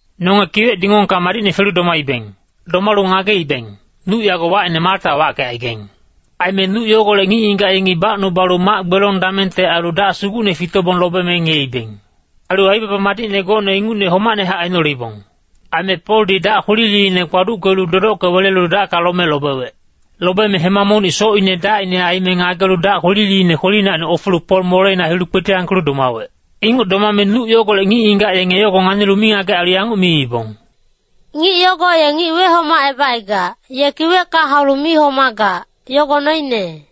Nonge kiwec dingongka madicne felu domaibeng. Domalu ngageibeng, nuc yago wacine Malta wackecaigaing. Aime nuc yogolec ngic-ngigac yengi bacnubalu mac-gbelong damengte ailu dac sugucne fitobong lobeme ngiyeibeng. Ailu aibaba madicne gocne ingucne homacnehac ainoleibong. Aime Poldi dac kwililiine kpaduckelu dodocke welelu dacka lome lobewec. Lobeme hema monic socine dacine aime ngagelu dac kwililiine kwelinacni ofelu Pol moleina hilu kpetiyangkelu domawec. Inguc domame nuc yogolec ngic-ngigac yenge yogo nganilu mingagec ailu yanguc miibong, “Ngic yogo ye ngic wehomacebacaigac, ye kiwecka haulu mi homagac, yogo noine.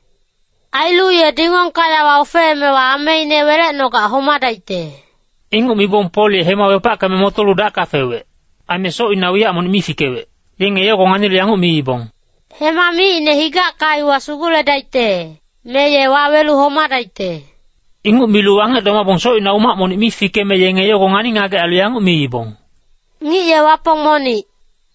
Ailu ye dingongka yawa ofeemewa ameine welecnogac homadaicte.” Inguc mibong Pol ye hema wepackeme motolu dacka fewec. Aime socina wiyac monic mi fikewec. Yenge yogo nganilu yanguc miibong, “Hema micine higacka iwa suguledaicte, me ye wawelu homadaicte.” Inguc milu wangec domabong socina umac monic mi fikeme yenge yogo ngani-ngagec ailu yanguc miibong, “Ngic ye wapong monic.”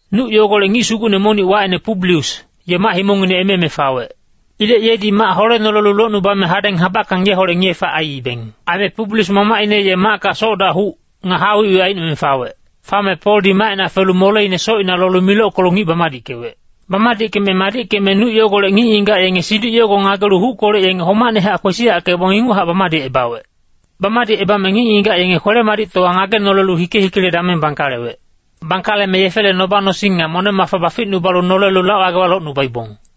Nuc yogolec ngic sugucne monic wacine Publius, ye mac-himongngine eme-eme fawec. Ilec yedi mac holenolelu locnubame hadeng habackang yeholec ngiye-fac aiibeng. Aime Publius mamacine ye macka soc-dac huc, nga haa wicwic aicnome fawec. Fame Poldi macina felu moleine socina lolu milockelu ngic bamadickewec. Bamadickeme madickeme nuc yogolec ngic-ngigac yenge siduc yogo ngagelu huckolec yenge homacnehac kwesiyackebong inguchac bamadicebawec. Bamadicebame ngic-ngigac yenge kwele-madictowa ngagenolelu hike-hikele dameng bangkalewec. Bangkaleme yefele noba-nosing nga moneng-mafa baficnubalu nolelu lac-wagewa locnubaibong.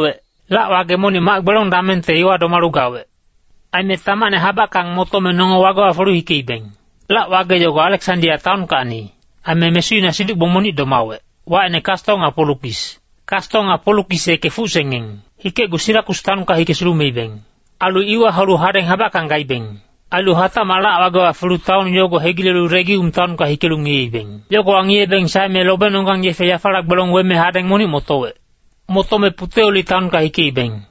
Lac-wage monic mac-gbelong damengte iwa domalu gawec. Aime tamacne habackang motome nonge wagewa felu hikeibeng. Lac-wage yogo Aleksandia taonkacni, aime mesuina siduc-gbong monic domawec, wacine Kasto nga Polukis. Kasto nga Polukis yeke fucsengeng. Hikecgu Sirakus taonka hike sulumeibeng. Ailu iwa haulu hadeng habackang gaibeng. Ailu hatacmac lac-wagewa felu taon yogo hegilelu Regium taonka hikelu ngiyeibeng. Yogowa ngiyebeng saeme lobenonggang yefe yafala gbelong weme hadeng monic motowec. Motome Puteoli taonka hikeibeng.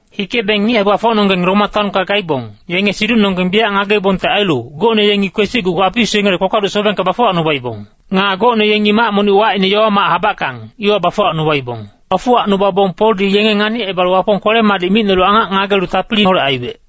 Hikebeng ngic hae-gbafocnonggeng Roma taonka gaibong, yenge siducnonggeng biyac ngageibongte ailu, gocne yengi kwesicgu Apius yengele kpakpaduc sobengka bafuwacnubaibong. Nga gocne yengi mac monic wacine Yowa-mac Habackang, iwa bafuwacnubaibong. Bafuwacnubabong Poldi yenge nganicebalu Wapong kwele-madic micnolu angac ngagelu tapiliholec aiwec.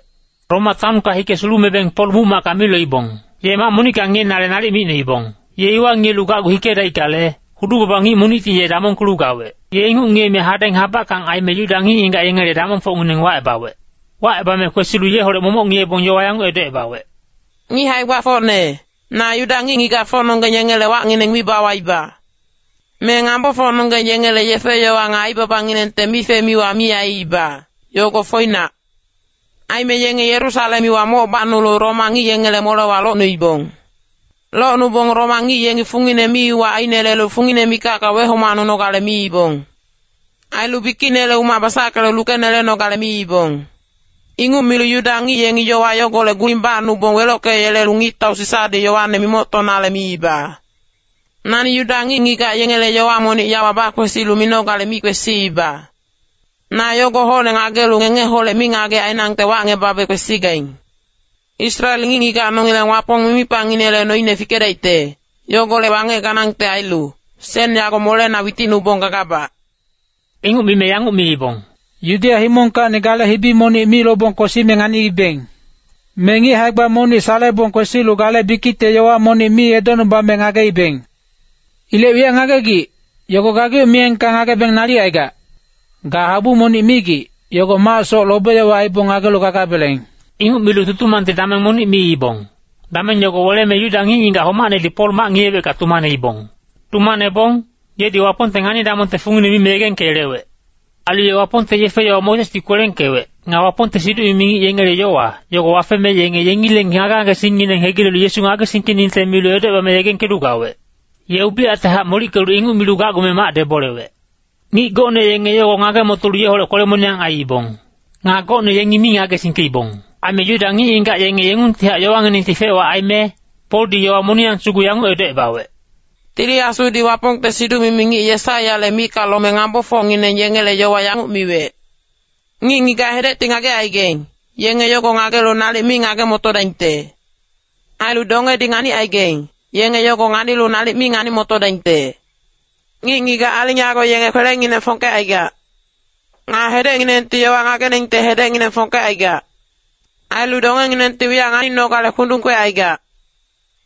Roma taonka hike sulumebeng Pol muc-macka mi loibong. Ye mac monicka ngiyenale nalic micnoibong. Ye iwa ngiyelu gacgu hikedaickale, hudu-baba ngic monicti ye damongkelu gawec. Ye inguc ngiyeme hadeng habackang aime Yuda ngic-ngigac yengele damongfocngineng wacebawec. Wacebame kwesilu yeholec momoc ngiyebong yowa yanguc edocebawec, “Ngic hae-gbafocne, na Yuda ngic-ngigacfocnonggeng yengele wacngineng mi bawaiba. Me ngambofocnonggeng yengele yefe-yowa nga aibabanginengte mife-miwa mi aiiba, yogo foinac. Aime yenge Yerusalem iwa moc bacnulu Roma ngic yengele molewa locnuibong. Locnubong Roma ngic yengi fungine mi-uwac ainelelu fungine mikacka wehomacnunogale miibong. Ailu bikicnele umac basackelu lukenelenogale miibong. Inguc milu Yuda ngic yengi yowa yogolec guling bacnubong welockeyelelu ngictau Sisadi yowane mimoctonale miiba. Nani Yuda ngic-ngigac yengele yowa monic yawa bakwesilu minogale mi kwesiiba. Na yogo hocne ngagelu ngengeholec mingagec ainangte wacngebabe kwesigaing. Israel ngic-ngigac nongileng Wapong mimipangnginele noine fikedaicte, yogolec wangec ganangte ailu, sen yago molena witicnubong gagabac.” Inguc mime yanguc miibong, “Yudeya himongkacni gale hibi monic mi lobong kwesime nganiibeng. Me ngic hae-gba monic salebong kwesilu gale bikicte yowa monic mi edocnubame ngageibeng. Ilec wiyac ngagegic, yogo gageuc miyengka ngagebeng nalic aigac. Ga habu monic migic, yogo macsoc lobe-yowa aibong ngagelu gagabeleng.” Inguc milu tutumangte dameng monic miibong, dameng yogo weleme Yuda ngic-ngigac homacnedi Pol mac ngiyewecka tumaneibong. Tumanebong, yedi Wapongte ngani-damongte fungine mime yegengkeyelewec. Ailu ye Wapongte yefe-yowa Mosesdi kwelengkewec, nga Wapongte siduc-mimi ngic yengele yowa, yogo wafeme yenge yengileng ngage-ngagengineng hegilelu Yesu ngagesingkeningte milu edocebame yegengkelu gawec. Ye ubiyactehac molickelu inguc milu gacgume mac debolewec. Ngic gocne yenge yogo ngage-motolu yeholec kwele-moniyang aiibong. Nga gocne yengi mi ngagesingkeibong. Aime Yuda ngic-ngigac yenge yengungtihac yowanginengti fec-wac aime, Poldi yowa moniyang sugu yanguc edocebawec, “Tili Asudi Wapongte siduc-mimi ngic Yesaiyale micka lome ngambofocngineng yengele yowa yanguc miwec. ‘Ngic-ngigac hedecti ngagecaigaing, yenge yogo ngagelu nalic mi ngage-motodaingte. Ailu dongedi nganicaigaing, yenge yogo nganilu nalic mi ngani-motodaingte. Ngic-ngigac aling yago yenge kwelengineng fongkecaigac. Nga hedecnginengti yowa ngageningte hedecngineng fongkecaigac. Ailu dongenginengti wiyac nganinogale kundung kwecaigac.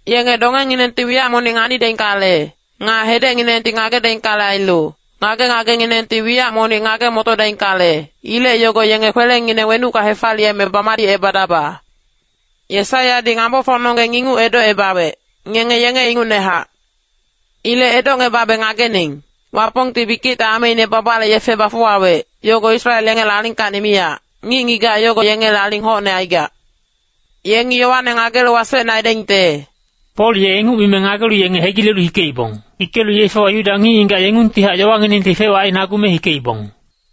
Yenge dongenginengti wiyac monic nganidaingkale, nga hedecnginengti ngagedaingkale ailu, ngage-ngagenginengti wiyac monic ngage-motodaingkale, Ilec yogo yenge kwelengineng wenucka hefaliyeme bamadicebadaba.’ Yesaiyadi ngambofocnonggeng inguc edocebawec, ngenge yenge ingucnehac. Ilec edocngebabe ngagening, Wapongti bikicte ameine babale yefe bafuwawec, yogo Israel yengele alingkacni miyac, ngic-ngigac yogo yengele aling hocne aigac. Yengi yowane ngagelu wasecne aidaingte.” [Pol ye inguc mime ngagelu yenge hegilelu hikeibong. Hikelu yefewa Yuda ngic-ngigac yengungtihac yowanginengti fec-wac ainagume hikeibong.]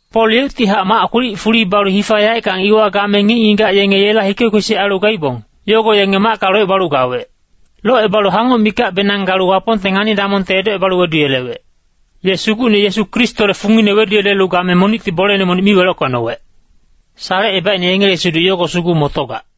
Pol yeuctihac mac kwilic fuli balu hifa yaeckang iwa game ngic-ngigac yenge yela hike-kwesic ailu gaibong, yogo yenge macka locebalu gawec. Locebalu hangoc mikacbenang galu Wapongte ngani-damongte edocebalu weduyelewec. Ye Sugucne Yesu Kristole fungine weduyelelu game monicti boleine monic mi welockecnowec. Salecebaicne yengele siduc yogo sugu motogac.